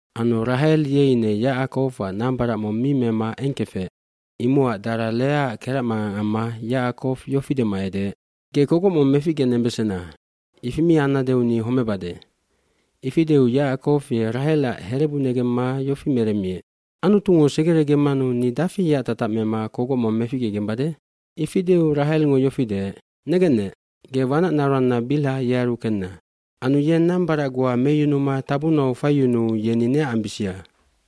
Anu Rahel ye ine Yacakowac nambarac mong mi mema eng kefec. Imocac dara Leaac keracmangang amma Yacakow yofi dema edeec, “Ge kogoc mong meficgenembesena, ifi mi annadeu ni homebade.” aIfi deu Yacakow ye Rahelac herebu negemma yofi meremmiec, “Anutungo segeregemmanu ni dafi yeac tatac mema kogoc mong meficgegembade?” bIfi deu Rahelngo yofi deec, “Negennec, ge wanacnaroanna Bilha yearu kenna. Anu yeng nambarac goa meyunuma tabunau faiyunuu yeni neac ambisia.”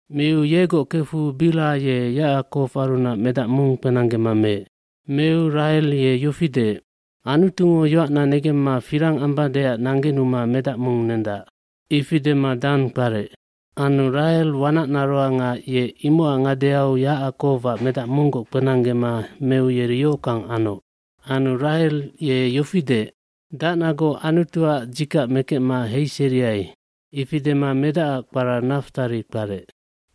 Miu yegoc kefu Bilha ye Yacakowarunac medac mong kpenanggema meec. Meu Rahel ye yofi deec, “Anutungo yoacna negemma firang ambadeac nanggenuma medac mong nendac.” Ifi dema Danc kparec. Anu Rahel wanacnaroanga ye imocac ngadeau Yacakowac medac monggoc kpenanggema meu yeri yohockang anoc. Anu Rahel ye yofi deec, “Dacnagoc Anutuac dzikac mekecma heiseriai.” Ifi dema medacac kpara Naftalid kparec.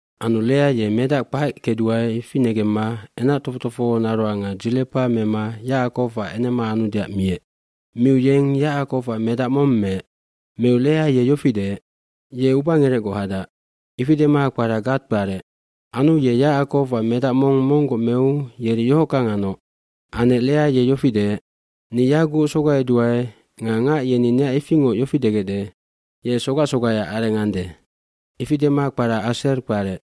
Anu Lea ye medac kpac kecdua ifi negemma enac tofoc tofohonaroanga Dzilepa mema Yacakowac enema anudeac miec. Miu yeng Yacakowac medac mong meec. Meu Lea ye yofi deec, “Ye ubangerecgoc hadac.” Ifi dema kpara Gade kparec. Anu ye Yacakowac medac mong monggoc meu yeri yohockang anoc. gAnec Lea ye yofi deec, “Ni yaguc sogaiduae nga ngac yeni neac ifingoc yofi degecde, ‘Ye sogac sogaiac areng ande.’” Ifi dema kpara Aserf kparec.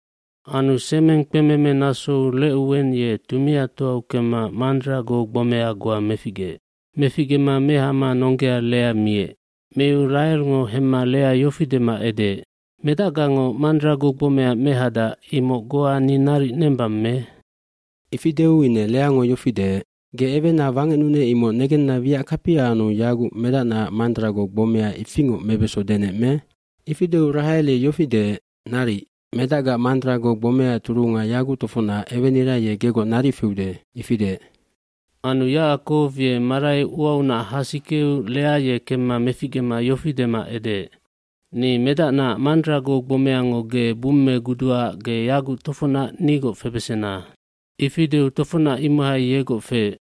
Anu semeng kpememe nasou Recuwen ye tumiatoau kemma mandrago gbomeah goa meficgeec. Meficgema mehama nonggea Lea miec. Miu Rahelngo hemma Lea yofi dema edeec, “Medacgango mandrago gbomea mehadac imoc goa ni naric nembang me?” Ifi deu ine Leango yofi deec, “Ge ewena wangecnunec imoc negenna wiac kapia anu yaguc medacnaac mandrago gbomea ifingoc mebeso denec me?” Ifi deu Rahel ye yofi deec, “Naric, medacgaac mandrago gbomeaac turunga yaguc tofocnac ewenira ye gegoc naric feude.” Ifi deec. Anu Yacakow ye marai uaunac hasikeu Lea ye kemma meficgema yofi dema edeec, “Ni medacnaac mandrago gbomeango ge bummeguduaac ge yaguc tofocnac nigoc febesena.” Ifi deu tofocnac imohai yegoc feec.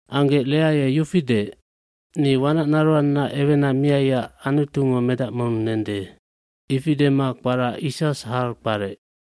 Anggec Lea ye yofi deec, “Ni wanacnaroanna ewena miaiac Anutungo medac mong nende.” Ifi dema kpara Issasharj kparec.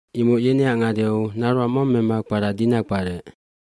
Imoc yeneac ngadeau naroang mong mema kpara Dina kparec.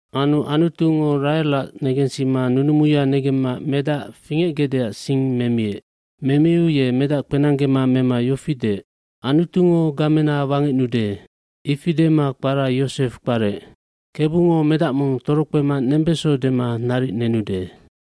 lAnu Anutungo Rahelac negensima nunumuya negemma medac fingecgecdeac sing memiec. Memiu ye medac kpenanggema mema yofi deec, “Anutungo gamena wangecnude.” Ifi dema kpara Yosefm kparec, “Kebungo medac mong torokpema nembeso dema naric nenude.”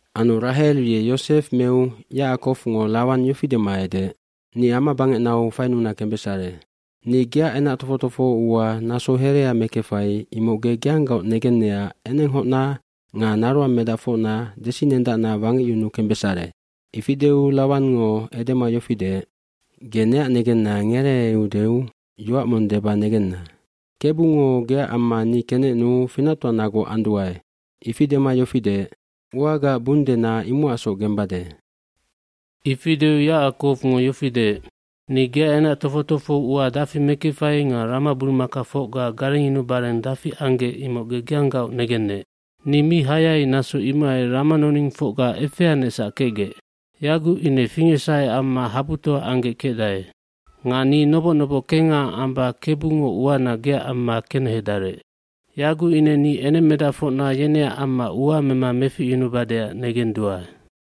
Anu Rahel ye Yosef meu Yacakowngo Lawan yofi dema edeec, “Ni amabangecnau fainuna kembesare. nNi geac enac tofoc tofoho ua naso herea mekefai imoc ge geanggaoc negennecac enenghocna nga naroangmedacfocna desinendacna wangecyunu kembesare.” oIfi deu Lawangngo edema yofi deec, “Ge neac negenna ngereeudeu yoac mong deba negenna. ‘Kebungo geac amma ni kenecnuu finactoanagoc anduae.’” Ifi dema yofi deec, “Uagaac bung dena imocacsoc gembade.” Ifi deu Yacakowngo yofi deec, “Ni geac enac tofoc tofoho ua dafi mekefai nga ramaburumakafocga garengyunubareng dafi anggec imoc ge geanggaoc negennec. Ni mi hayai naso imohai ramanoningfocga efeanecsac kecgec. Yaguc ine fingecsahe amma habutoa anggec kecdae. Nga ni noboc noboc kengha amba Kebungo uana geac amma kenehedarec. Yaguc ine ni enengmedacfocna yeneac amma ua mema meficyunubadeac negenduae.”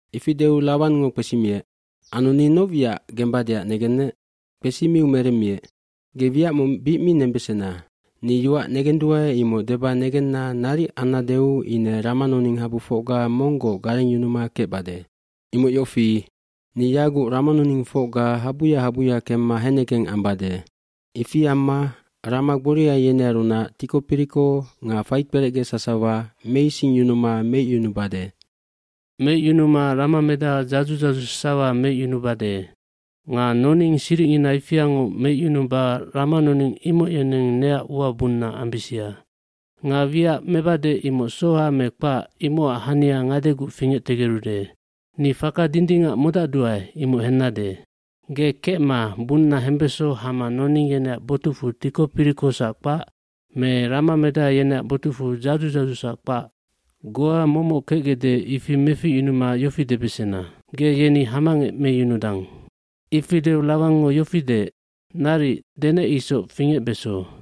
Ifi deu Lawangngo kpesimiec, “Anu ni noc wiac gembadeac negennec?” Kpesimiu meremmiec, “Ge wiac mong bic mi nembesena. Ni yoac negenduae imoc deba negenna naric annadeu ine ramanoninghabufocga monggoc garengyunuma kecbade. Imoc yofi, ni yaguc ramanoningfocga habuya habuya kemma hennegeng ambade. Ifi amma rama gboria yenearunac tiko piriko nga faikperecge sasawa meisingyunuma meicyunubade. Meicyunuma ramamedaha dzadzu dzadzu sasawa meicyunubade. Nga noning siricngina ifiangoc meicyunuba ramanoning imoc yeneng neac ua bunna ambisia. Nga wiac mebade imoc soha me kpac, imocac hania ngadeguc fingectegerude. Ni faka dindingac modacdua imoc hennade. Ge kecma bunna hembeso hama noning yeneac botucfu tiko pirikosac kpac me ramamedaha yeneac botucfu dzadzu dzadzusac kpac, goa momoc kecgecde ifi meficyunuma yofi debesena. Ge yeni hamangec meyunudang.” Ifi deu Lawangngo yofi deec, “Naric, denec isoc fingecbeso.”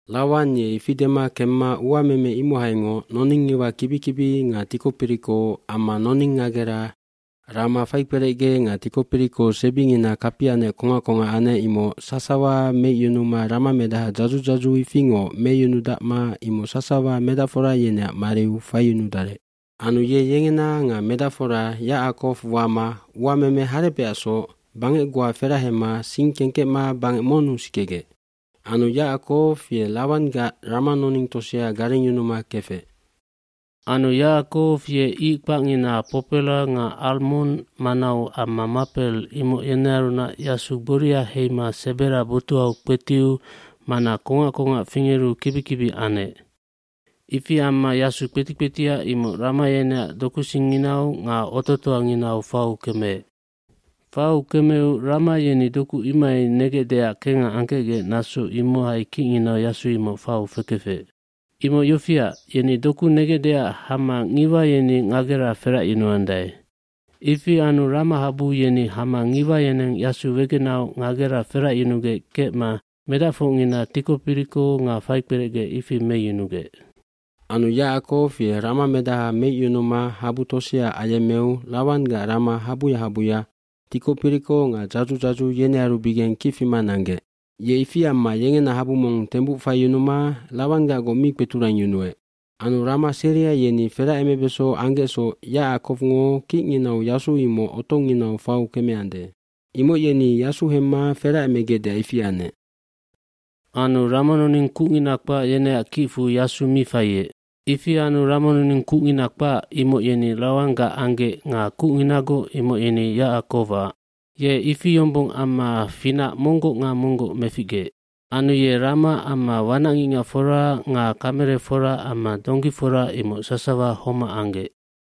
Lawan ye ifi dema kemma uameme imohaingoc noningngiwa kibi kibi nga tiko piriko amma noning ngagera rama faikperecge nga tiko piriko sebingina kapianec kongac kongac anec imoc sasawa meicyunuma ramamedaha dzadzu dzadzu ifingoc meyunudacma imoc sasawa medacfora yeneac mariu faiyunudarec. Anu ye yengena nga medacfora Yacakow wama uameme harebecacsoc bangec goa ferahema sing kengkecma bangec monnu sikegec. Anu Yacakow ye Lawanggac ramanoning tosea garengyunuma kefec. Anu Yacakow ye ic kpacngina popelap nga almondq manau amma mapel,r imoc yenearunac yasu gboria heima sebera botuhau kpetiu mana kongac kongac fingeru kibi kibi anec. Ifi amma yasu kpeti kpetia imoc rama yeneac dokusingnginau nga ototoanginau fau kemeec. Fau kemeu rama yeni doku imohai negecdeac kengha angkecgec naso imohai kicnginau yasu imoc fau fekefec. Imoc yofiac, yeni doku negecdeac hama ngiwa yeni ngagera feracyunuandae. Ifi anu ramahabu yeni hama ngiwa yeneng yasu wegenahau ngagera feracyunugec kecma medacfocngina tiko piriko nga faikperecge ifi meyunugec. Anu Yacakow ye ramamedaha meicyunuma habu tosea ayemmeu Lawanggac rama habuya habuya tiko piriko nga dzadzu dzadzu yenearubigeng kic fima nanggec. Ye ifi amma yengena habu mong tembuc faiyunuma Lawanggacgoc mi kpeturangyunuec. Anu rama seria yeni feracemebeso anggecsoc Yacakowngo kicnginau yasu imoc otonginau fau kemeande. Imoc yeni yasu hemma feracemegecdeac ifi anec. Anu ramanoning kucngina kpac yeneac kicfu yasu mi faiec. Ifi anu ramanoning kucngina kpac, imoc yeni Lawanggac anggec nga kucnginagoc imoc yeni Yacakowac. sYe ifi yombong amma finac monggoc nga monggoc meficgeec. Anu ye rama amma wanacngicngacfora nga kamelefora amma donggifora imoc sasawa homac anggec.